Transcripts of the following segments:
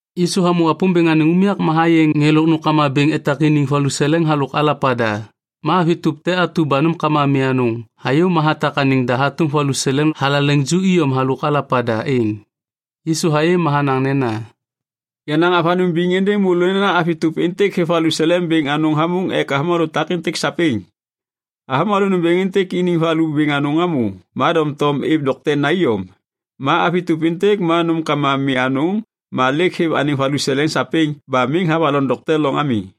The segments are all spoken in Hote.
Yisu hamô Wapômbêŋ anêŋ unyak ba hayê ŋê lôk nômkama bêŋ etak iniŋ valuseleŋ halôk alapa da. Ma avi tôp te atu ba nômkama mi anôŋ hayô ma hatak anêŋ da hatôm valuseleŋ thalaleŋ ju iyom halôk alapa da êŋ. Yisu hayê ma hanaŋ nena, “Yanaŋ avanôŋ biŋ êndêŋ môlô nena avi tôp êntêk hêv valuseleŋ bêŋ anôŋ hamôŋ ek avômalô takêntêk sapêŋ. Avômalô nômbêŋ êntêk iniŋ valu bêŋ anôŋ hamô ma doŋtom êv doktena iyom. Ma avi tôp êntêk ma nômkama mi anôŋ ma lêk hêv anêŋ valuseleŋ sapêŋ ba miŋ havaloŋ dokte loŋ ami.”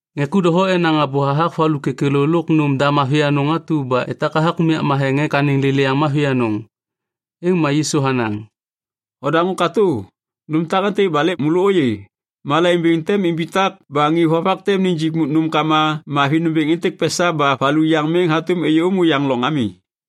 Ŋê ku doho enaŋ abô hathak valu kêkêlô lôk nôm da mavi anôŋ atu ba etak hathak unyak matheŋ ek anêŋ lêlêyaŋ mavi anôŋ. Êŋ ma Yisu hanaŋ, “Odaŋô katô. Nôm takêntêk ba lêk môlô ôyê, malaiŋ bêŋ tem imbitak ba ŋê vovak tem nijik nômkama mavi nômbêŋ êntêk pesa ba valu yaŋ miŋ hatôm êyômô yaŋ loŋ ami.”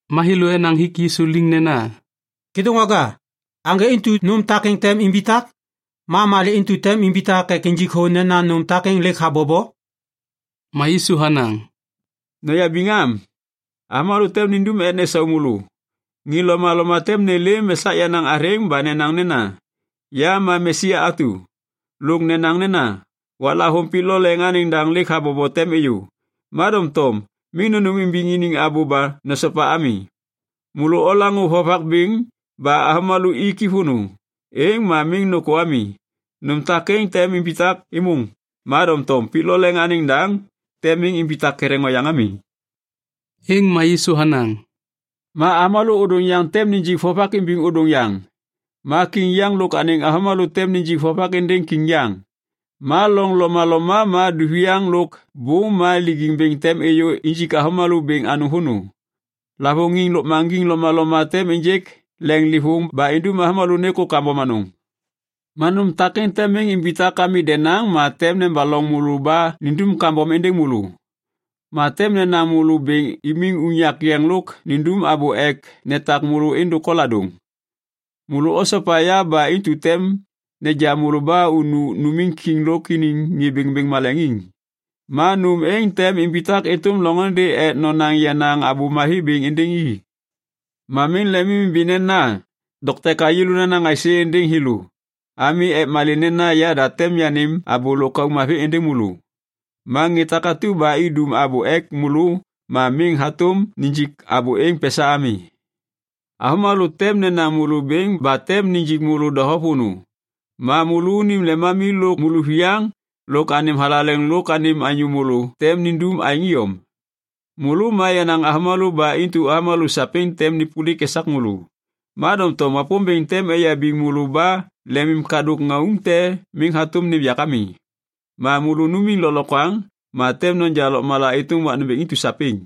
Ma thêlô enaŋ hik Yisu liŋ nena, “Kêdôŋwaga, aŋgê intu nôm takêŋ tem imbitak? Ma malê intu tem imbitak ek injik thô nena nôm takêŋ lêk habobo?” Ma Yisu hanaŋ, “Noyabiŋ am, avômalô tem nindum ek nesau môlô. Ŋê lomaloma tem nêlêm esak yenaŋ athêŋ ba nenaŋ nena, ‘Ya ma Mesia atu’. Lôk nenaŋ nena, ‘Waklavôŋ pik lo leŋ anêŋ daŋ lêk habobo tem êyô.’ Ma doŋtom miŋ nônêmimbiŋ iniŋ abô ba nosopa ami. Môlô olaŋô vovak bêŋ ba avômalô iki vônô, êŋ ma miŋ nôkô ami. Nôm takêŋ tem imbitak êmôŋ, ma doŋtom pik lo leŋ anêŋ daŋ tem miŋ imbitak ketheŋ oyaŋ ami.” Êŋ ma Yisu hanaŋ, “Ma avômalô ôdôŋ yaŋ tem nijik vovak imbiŋ ôdôŋ yaŋ. Ma kiŋ yaŋ lôk anêŋ avômalô tem nijik vovak êndêŋ kiŋ yaŋ. Ma loŋ lomaloma ma duviaŋ lôk bôm ma lijiŋ bêŋ tem êyô injik avômalô bêŋ anôŋ vônô. Lavôŋiŋ lôkmaŋgiŋ lomaloma tem ênjêk leŋlêvôŋ ba indum avômalô nêkô kambom anôŋ. “Ma nôm takêŋ tem miŋ imbitak ami denaŋ ma tem nebaloŋ môlô ba nindum kambom êndêŋ môlô. Ma tem nenaŋ môlô bêŋ imiŋ unyak yeŋ lôk nindum abô ek netak môlô êndôk koladôŋ. Môlô osopa ya ba intu tem neja môlô ba unu numiŋ kiŋ lôk iniŋ ŋê bêŋbêŋ maleŋiŋ. Ma nôm êŋ tem imbitak êtôm loŋôndê ek nonaŋ yenaŋ Abô Mavi bêŋ êndêŋ i. Ma miŋ lemimimbi nena, ‘Dokte ka yêlô nanaŋ aisê êndêŋ thêlô’ ami. Ek malê nena yada tem yanêm abô lôkauk mavi êndêŋ môlô. Ma ŋê takatu ba idum abô ek môlô ma miŋ hatôm nijik abô êŋ pesa ami. Avômalô tem nenaŋ môlô bêŋ ba tem nijik môlô doho vônô ma môlônim lemami lôk môlôviyaŋ lôk anêm thalaleŋ lôk anêm anyô môlô tem nindum aêŋ iyom. Môlô ma yenaŋ avômalô ba intu avômalô sapêŋ tem nêpôlik esak môlô. Ma doŋtom Wapômbêŋ tem eyabiŋ môlô ba lemimkadôk ŋauŋ te miŋ hatôm nêm yak ami. Ma môlô numiŋ lôklokwaŋ ma tem noja lôkmala êtôm wak nômbêŋ intu sapêŋ.”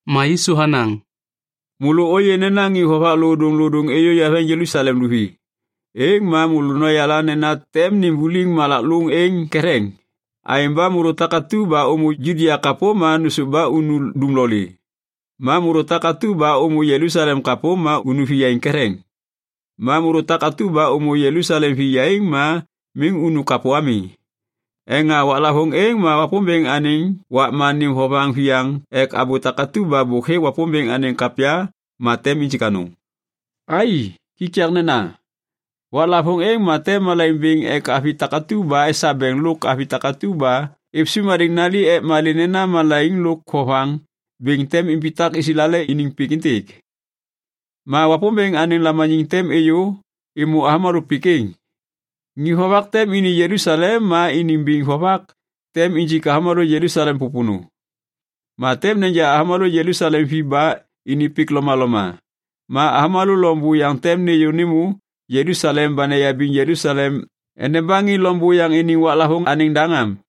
Ma Yisu hanaŋ, “Môlô ôyê nena ŋê vovak lodôŋlodôŋ êyô eveŋ Jelusalem luvi, êŋ ma môlô noyala nena tem nimbuliŋ malak lôŋ êŋ ketheŋ. Aêŋ ba môlô takatu ba ômô Judia kapô, ma nôsôv ba unu dumlolê. Ma môlô takatu ba ômô Jelusalem kapô, ma unu viyaiŋ ketheŋ. Ma môlô takatu ba ômô Jelusalem viyaiŋ, ma miŋ unu kapô ami. Ek malê nena waklavôŋ êŋ ma Wapômbêŋ anêŋ wakma nêm vovaŋ viyaŋ ek abô takatu ba hêk Wapômbêŋ anêŋ kapya ma tem injik anôŋ. Ai, kikaknena. Waklavôŋ êŋ ma tem malaiŋ bêŋ ek avi takatu ba esabeŋ lôk avi takatu ba êv sôm hadêŋ nali ek malê nena malaiŋ lôk vovaŋ bêŋ tem imbitak Islael iniŋ pik êntêk, ma Wapômbêŋ anêŋ lamaniŋ tem êyô êmô avômalô pik êŋ. Ŋê vovak tem ini Jelusalem ma iniŋ biŋ vovak tem injik avômalô Jelusalem pôpônô. Ma tem neja avômalô Jelusalem vi ba ini pik lomaloma. Ma avômalô loŋ buyaŋ tem nêyô nêmô Jelusalem ba neyabiŋ Jelusalem endeba ŋê loŋ buyaŋ iniŋ waklavôŋ anêŋ daŋ am.”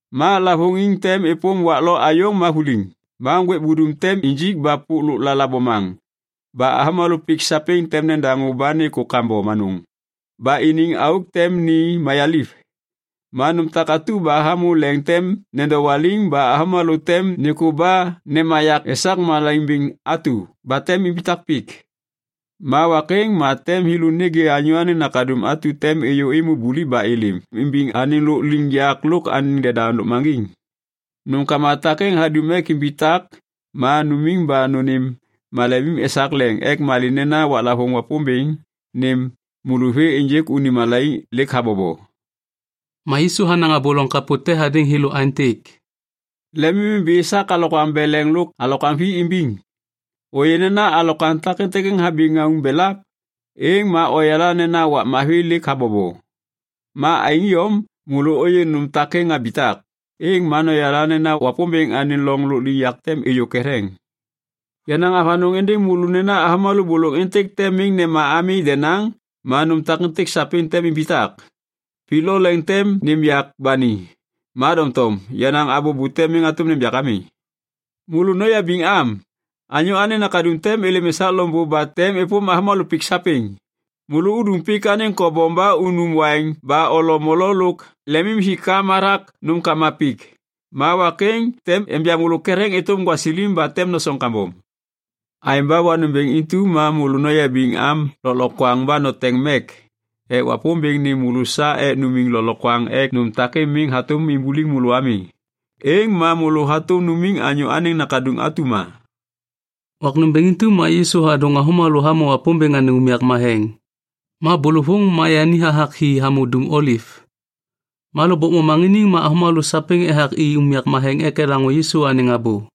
“Ma lavôŋiŋ tem êpôm wak lo ayôŋ ma vuliŋ. Ma ŋgwêk budum tem injik ba pôk lôklala bomaŋ ba avômalô pik sapêŋ tem nedaŋô ba nêkô kambom anôŋ ba iniŋ auk tem ni mayaliv. Ma nôm takatu ba hamô leŋ tem nedowaliŋ ba avômalô tem nêkô ba nemayak esak malaiŋ bêŋ atu ba tem imbitak pik. Ma wak êŋ ma tem thêlô nêgê Anyô Anêŋ Nakaduŋ atu tem êyô êmô buliv ba êlêm imbiŋ anêŋ lôkliŋyak lôk anêŋ deda lôkmaŋgiŋ. Nômkama takêŋ hadum ek imbitak ma numiŋ ba nônêm malemim esak leŋ ek malê nena waklavôŋ Wapômbêŋ nêm môlô vê ênjêk unim malaiŋ lêk habobo.” Ma Yisu hanaŋ abô loŋ kapô te hadêŋ thêlô aêntêk, “Lemimimbi esak alokwaŋ beleŋ lôk alokwaŋ vi imbiŋ. Ôyê nena alokwaŋ takêntêk habi ŋauŋ belap, êŋ ma oyala nena wak mavi lêk habobo. Ma aêŋ iyom, môlô ôyê nôm takêŋ habitak, êŋ ma noyala nena Wapômbêŋ anêŋ loŋ lôkliŋyak tem êyô ketheŋ. “Yanaŋ avanôŋ êndêŋ môlô nena avômalô bôlôŋ êntêk tem miŋ nema ami denaŋ ma nôm takêntêk sapêŋ tem imbitak. Pik lo leŋ tem nêm yak ba ni, ma doŋtom yenaŋ abô bute miŋ hatôm nêm yak ami. “Môlô noyabiŋ am. Anyô Anêŋ Nakaduŋ tem êlêm esak loŋbô ba tem êpôm avômalô pik sapêŋ. Môlô udum pik anêŋ kobom ba unum waiŋ ba olo molo lôk lemimhikam hathak nômkama pik, ma wak êŋ tem enja môlô ketheŋ êtôm gwasilim ba tem nosoŋ kambom. Aêŋ ba wak nômbêŋ intu ma môlô noyabiŋ am lôklokwaŋ ba noteŋ mek ek Wapômbêŋ nêm môlô sa ek numiŋ lôklokwaŋ ek nôm takêntêk miŋ hatôm imbuliŋ môlô ami. Êŋ ma môlô hatôm numiŋ Anyô Anêŋ Nakaduŋ atu ma.” Wak nômbêŋ intu ma Yisu hadôŋ avômalô hamô Wapômbêŋ anêŋ unyak matheŋ. Ma bôlôvôŋ ma yani hathak hi hamô Dum Oliv. Ma lôkbôk momaŋiniŋ ma avômalô sapêŋ ethak i unyak matheŋ ek elaŋô Yisu anêŋ abô.